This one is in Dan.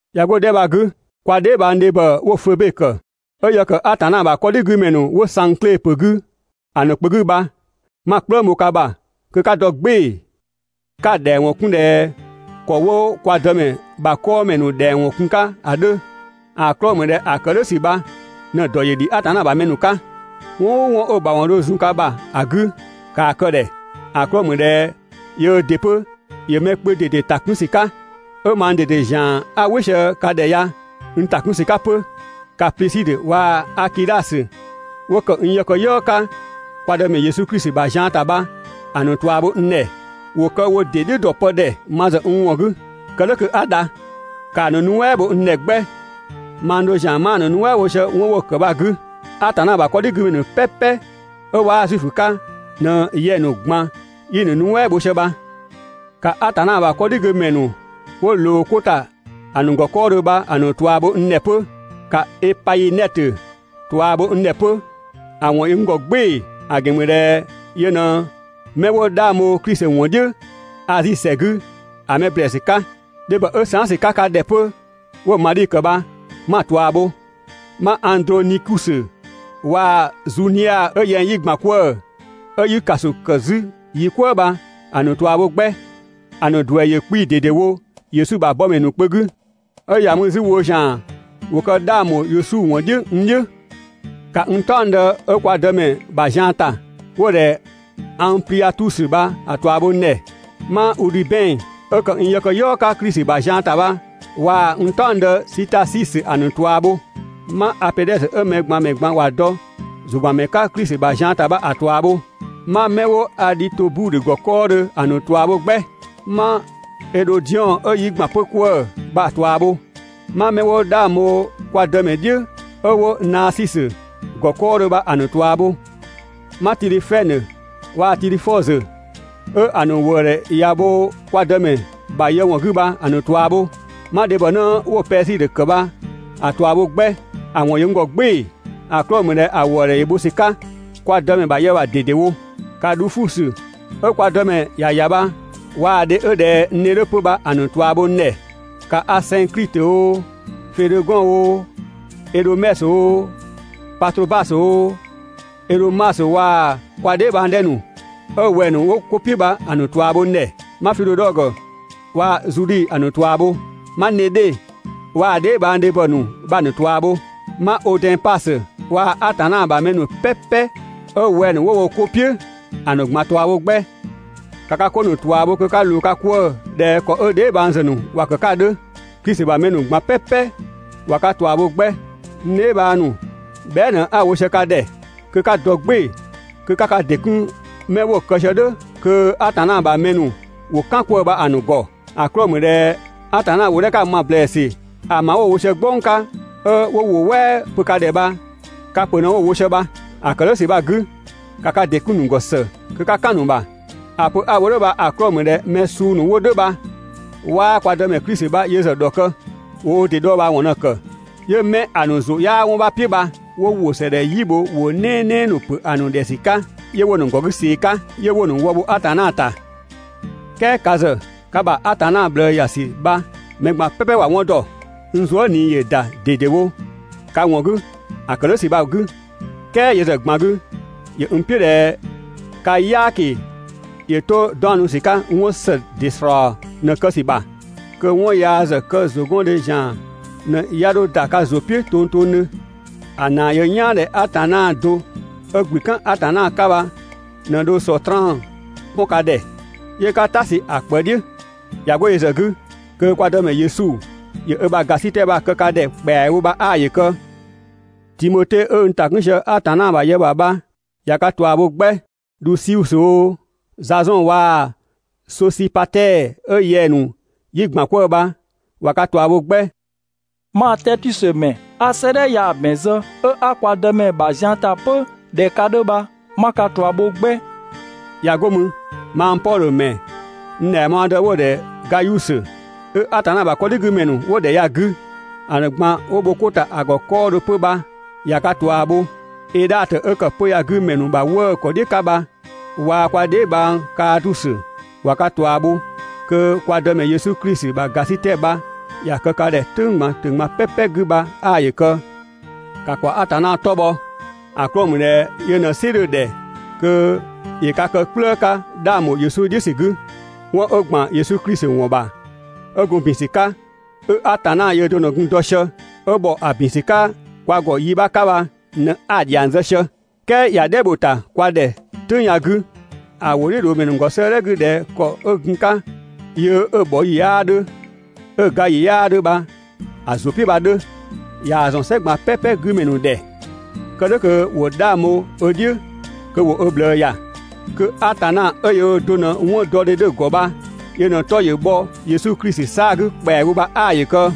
꞊Ya 'go‑ 'dhɛ bha‑ 'gü, kwa dheebhang ‑dhebhɔ 'wo Febe ‑kë, 'ö yë ‑kë Atanna ‑bha 'kɔdhigümɛ ‑nu 'wo Sangkle ‑pö 'gü ‑a ‑nu kpö 'gü bha, 'ma‑ "kplëng bho ka ‑bha kö 'ka dɔ "gbɩɩ‑, 'ka‑ ‑dhɛng ‑wɔn 'kun ꞊dhɛ ‑kɔ 'wo kwa Dëmɛ ‑bha 'kɔɔmɛ ‑nu ‑dhɛng kun‑ 'ka ‑a 'dhö. ‑A 'klɔɔ‑ ‑mü ꞊dhɛ ‑a ‑kë "dhʋ̈ ‑sü bha ꞊në‑ ‑dɔ ‑yö ‑dhi Atanna ‑bha mɛ ‑nu 'ka. 'Wɔn "ʋʋ 'wɔn 'ö‑ ‑bha ‑wɔn dho zun ka ‑bha ‑a 'gü, ‑kaa kë‑ ‑dhɛ, ‑a 'klɔɔ‑ ‑mü ꞊dhɛ yöö ‑dɩ 'pö ‑yö mɛ kpö ꞊dede ‑ta 'kun ‑sü 'ka, 'ö mang ꞊dede ‑zian 'a "wɩ sië ka ‑dhɛ ya n ‑ta 'kun ‑sü 'ka 'pö. ‑Ka Plisidhö waa‑ Akidhasö 'wo ‑kë n yëkëyɔɔ 'ka kwa Dëmɛ Yesu Klisi ‑bha zian ‑ta bha‑ ‑nu ꞊tua bho n ‑dhɛ. ‑Wo kë wo ‑dɩ "dhiʋ̈ ‑dɔ pë ‑dhɛ ma ‑zë n ‑wɔn 'gü, kë "dhʋ̈ kö 'a dha. ‑Kaa ‑nu nuɛ" bho n ‑dhɛ 'gbɛ, mang do ‑zian 'maa‑ ‑nu nuɛ" bho sië 'wɔn 'wo‑ ‑kë bha‑ 'gü. Atanna ‑bha 'kɔdhigümɛ ‑nu "pɛpɛ 'ö 'waa Zuifö 'ka ꞊në yɛng‑ ‑nu ꞊gban 'yi‑ ‑nu nuɛ" bho sië bha. ‑Ka Atanna ‑bha 'kɔdhigümɛ ‑nu 'wo ꞊loo 'ko ‑ta ‑a ‑nu ‑gɔ 'kɔɔdhö bha, ‑a ‑nu ꞊tua bho n ‑dhɛ 'pö. ‑Ka Epainɛtö ꞊tua bho n ‑dhɛ 'pö, ‑a ‑wɔn ‑yö n ‑gɔ "gbɩɩ‑, ‑a ‑gɛn ‑mü ꞊dhɛ yö ꞊në 'mɛ 'wo 'dhang bho Klisi ‑wɔn "dhiʋ̈ Azi ‑sɛ 'gü ‑a mɛ ‑blɛɛsü 'ka. Dhebhɔ 'ö saan" ‑sü 'ka ka ‑dhɛ 'pö 'wo‑ Madhi ‑kë bha, 'ma‑ ꞊tua bho. 'Ma Andronikusö waa‑ Zunia 'ö yɛng 'yi ‑gban 'kwëë‑, 'ö 'yi ‑kaso ‑kë 'zü yi "kwëë bha‑ ‑nu ꞊tua bho 'gbɛ. ‑A ‑nu ‑duɛ ‑yö 'kpii‑ ꞊dedewo Yesu ‑bha bɔmɛ ‑nu kpö 'gü, 'ö ‑ya mü 'zü woo ‑zian ‑wo kë 'dhang ‑bho Yesu ‑wɔn "dhiʋ̈ n "dhiʋ̈. ‑Ka n "taɔngdë 'ö kwa Dëmɛ ‑bha zian ‑ta, 'wo‑ ‑dhɛ Angpliatusö bha‑ ꞊tua bho n ‑dhɛ. 'Ma Udhibɛn 'ö ‑kë n yëkëyɔɔ 'ka Klisi ‑bha zian ‑ta bha waa‑ n "taɔngdë Sitasisö ‑a ‑nu ꞊tua bho. 'Ma Apedhɛsö 'ö mɛ ꞊gban ‑mɛ ꞊gban ‑wa dɔ ‑zʋ ‑gban ‑mɛ 'ka Klisi ‑bha zian ‑ta bha‑ ꞊tua bho. 'Ma 'mɛ 'wo Adhitobudhö ‑gɔ 'kɔɔdhö ‑a ‑nu ꞊tua bho 'gbɛ. 'Ma Edhodiɔn 'ö 'yi ‑gban 'pö 'kwëë‑ bha‑ ꞊tua bho. 'Ma 'mɛ 'wo 'dhang bho kwa Dëmɛ "dhiʋ̈ 'ö 'wo Naasisö ‑gɔ 'kɔɔdhö bha‑ ‑nu ꞊tua bho. 'Ma Tidhifɛnö waa‑ Tidhifɔzö 'ö‑ ‑nu ‑wëëdhɛ ꞊ya bho kwa Dëmɛ ‑bha yë ‑wɔn 'gü bha‑ ‑nu ꞊tua bho. 'Ma dhebhɔnë 'wo‑ Pɛsidö ‑kë bha‑ ꞊tua bho 'gbɛ, ‑a ‑wɔn ‑yö n ‑gɔ "gbɩɩ‑, ‑a 'klɔɔ‑ ‑mü ꞊dhɛ ‑a ‑wëëdhɛ ‑yö bho ‑sü 'ka kwa Dëmɛ ‑bha yë ‑bha ꞊dedewo. ‑Ka Dhufusö 'ö kwa Dëmɛ ‑ya ‑ya bha waa‑ dhe 'ö ꞊dhɛ n dhe 'dhö 'pö bha‑ ‑nu ꞊tua bho n ‑dhɛ. ‑Ka Asɛngklitö oo, Fedhegɔn oo, Ɛdhomɛsö oo, Patrobasö oo, Ɛdhömasö waa‑ kwa dheebhang 'dhɛ ‑nu 'ö wɛng‑ ‑nu 'wo 'ko "piʋ̈ bha‑ ‑nu ꞊tua bho n ‑dhɛ. 'Ma Fidhodhɔgö waa‑ Zudhi ‑a ‑nu ꞊tua bho. 'Ma Nedhe waa‑ ö dheebhang dhebhɔ bha‑ ‑nu ꞊tua bho. 'Ma Odɛnpasö waa‑ Atanna ‑bha mɛ ‑nu "pɛpɛ 'ö wɛng‑ ‑nu 'wo wo 'ko "piʋ̈, ‑a ‑nu ꞊gban ꞊tua bho 'gbɛ. ‑Ka ka 'ko ‑nu ꞊tua bho kö 'ka ꞊loo ka 'kwëë‑ ꞊dhɛ ‑kɔ 'ö dheebhang ‑zë ‑nu ‑wa ‑kë 'ka ‑a 'dhö. Klisi ‑bha mɛ ‑nu ꞊gban "pɛpɛ ꞊wa ka ꞊tua bho 'gbɛ. N dheebhang ‑nu, bhɛa" ꞊në 'a‑ wo sië ka ‑dhɛ kö 'ka dɔ "gbɩɩ‑ kö 'ka ka ‑dɩ 'kun mɛ 'wo‑ kë sië "dhʋ̈ kö Atanna ‑bha mɛ ‑nu ‑wo "kan 'kwëë‑ bha‑ ‑nu ‑gɔ. ‑A 'klɔɔ‑ ‑mü ꞊dhɛ Atanna ‑wʋ 'dhɛ 'ka‑ ma ‑blɛɛsü ‑a ‑ma 'wo‑ wo sië "gbɔng 'ka 'ö 'wo ‑wʋ "wɛɛ pö ka ‑dhɛ bha, ka ‑pö ꞊në 'wo‑ wo sië bha. ‑A ‑kë "dhʋ̈ ‑sü bha‑ 'gü, ‑ka ka ‑dɩ 'kun‑ ‑nu ‑gɔ ‑së kö 'ka "kan‑ ‑nu ‑bha. ‑A pö 'a‑ wo "dhʋ̈ bha‑ 'klɔɔ‑ ‑mü ꞊dhɛ mɛ suu ‑nu 'wo "dhʋ̈ bha 'waa kwa Dëmɛ Klisi bha yö ‑zë ‑dhɔkë, ‑wo wo ‑dɩ dhɔɔbhaawɔn ꞊në‑ ‑kë. 'Yö 'mɛ ‑a ‑nu ‑zʋ 'yaa 'wɔn 'bha "piʋ̈ bha 'wo ‑wʋ ‑së ‑dhɛ "yi bho ‑wʋ "nɛɛnɛɛ ‑nu ‑pö ‑nu ‑dhɛ ‑sü 'ka 'yö 'wo‑ ‑nu ‑gɔ 'gü ꞊see‑ 'ka, 'yö 'wo‑ ‑nu wë bho Atanna ‑ta. "Kɛɛ ka ‑zë ka ‑bha Atanna ꞊bhlëë ‑ya ‑sü bha mɛ ꞊gban "pɛpɛ ‑wa 'wɔn ‑dɔ. N zuë" ꞊nii ‑yö ‑da ꞊dedewo ka ‑wɔn 'gü ‑a ‑kë "dhʋ̈ ‑sü bha‑ 'gü, "kɛɛ yö ‑zë ꞊gban 'gü, ‑yö n "piʋ̈ ꞊dhɛ ka "yaaki ‑yö 'to 'daɔnnu ‑sü 'ka 'wɔn ‑së ‑dɩ ‑slɔɔ ꞊në‑ kë ‑sü ‑bha, kö 'wɔn yaa ‑zë kë ‑zʋgɔndhe ‑zian ꞊në 'ya 'dho ‑da ka ‑zʋ "piʋ̈ tongtongdhö. ‑A ‑naa ‑yö n "yaan ꞊dhɛ Atanna do 'ö ‑gblü "kan Atanna 'ka bha ꞊në dho Sɔtraan 'pɔn ka ‑dhɛ 'yö 'ka "ta sü ‑a ꞊kpë "dhiʋ̈. ꞊Ya 'go yö ‑zë 'gü, kö kwa Dëmɛ Yesu ‑yö ö ‑bha ‑gasitɛ bha‑ kë ka ‑dhɛ ‑kpɛawo bha 'aa ‑yö kë! Timote 'ö n ‑ta 'kun sië Atanna ‑bha yë ‑bha bha, ꞊ya ka ꞊tua bho 'gbɛ. Dhusiusö oo, Zazɔn waa‑ Sosipatɛɛ 'ö yɛng‑ ‑nu 'yi ‑gban 'kwëë‑ bha, ꞊wa ka ꞊tua bho 'gbɛ. Mang Tɛɛtiusö ‑mɛ 'a 'sëëdhɛ ya‑ ‑bɛn zë 'ö 'a kwa Dëmɛ ‑bha zian ‑ta 'pö ꞊dhɛ ka 'dhö bha, 'ma ka ꞊tua bho 'gbɛ. ꞊Ya 'go mü, mang Pɔdhö ‑mɛ n ‑dhɛngbhɔɔdë 'wo‑ ‑dhɛ Gayusö, 'ö Atanna ‑bha 'kɔdhigümɛ ‑nu 'wo ‑dhɛ ya‑ 'gü ‑a ‑nu ꞊gban 'wo bho 'ko ‑ta ‑a ‑gɔ 'kɔɔdhö 'pö bha, ꞊ya ka ꞊tua bho. Edhatö 'ö kë 'pö‑ ya‑ 'gü ‑mɛ ‑nu ‑bha 'wëëkɔdhiʋ̈ 'ka bha waa‑ kwa dheebhang Kaatusö, ꞊wa ka ꞊tua bho. [Kö kwa Dëmɛ Yesu Klisi ‑bha ‑gasitɛ bha ‑ya kë ka ‑dhɛ "tʋ̈ng ꞊gban "pɛpɛ 'gü bha 'aa ‑yö kë.] ‑Ka ‑kwa Atanna 'tɔ bhɔ, ‑a 'klɔɔ‑ ‑mü ꞊dhɛ yö ꞊në‑ "sɩ 'dhö‑ ‑dhɛ kö ‑yö ka kë "kplëë 'ka 'dhang ‑bho Yesu "dhiʋ̈ ‑sü 'gü. 'Wɔn 'ö ‑gban Yesu Klisi ‑wɔn ‑bha 'ö gun ‑bin ‑sü 'ka, 'ö Atanna yöö do ꞊në gun‑ dɔ sië, 'ö ‑bhɔ ‑a ‑bin ‑sü 'ka kwa ‑gɔ yi 'bha 'ka bha ꞊në 'a‑ ‑dhiang zë sië. "kɛɛ ꞊ya "dhɛ bho‑ ‑ta kwa ‑dhɛ "tʋ̈ng ya‑ 'gü ‑a ‑wʋdhiʋ̈loomɛ ‑nu ‑gɔ 'sëëdhɛ 'gü ꞊dhɛ ‑kɔ 'ö gun‑ 'ka yöö 'ö‑ bhɔ ‑yi 'yaa 'dhö, 'ö‑ ga ‑yi 'yaa 'dhö bha‑ ‑zʋ "piʋ̈ bha‑ 'dhö. ꞊Yaa‑ ‑zɔn "sɛ ꞊gban "pɛpɛ 'gü ‑mɛ ‑nu ‑dhɛ, kë "dhʋ̈ kö ‑wo 'dhang bho ö "dhiʋ̈ kö ‑wo ö ꞊bhlëë ‑ya. Kö Atanna 'ö yöö do ꞊në 'wɔndɔdhe 'dhö‑ ‑gɔ bha yö ꞊në‑ 'tɔ ‑yö bhɔ Yesu Klisi 'saa‑ 'gü ‑kpɛawo bha 'aa‑ ‑yö kë.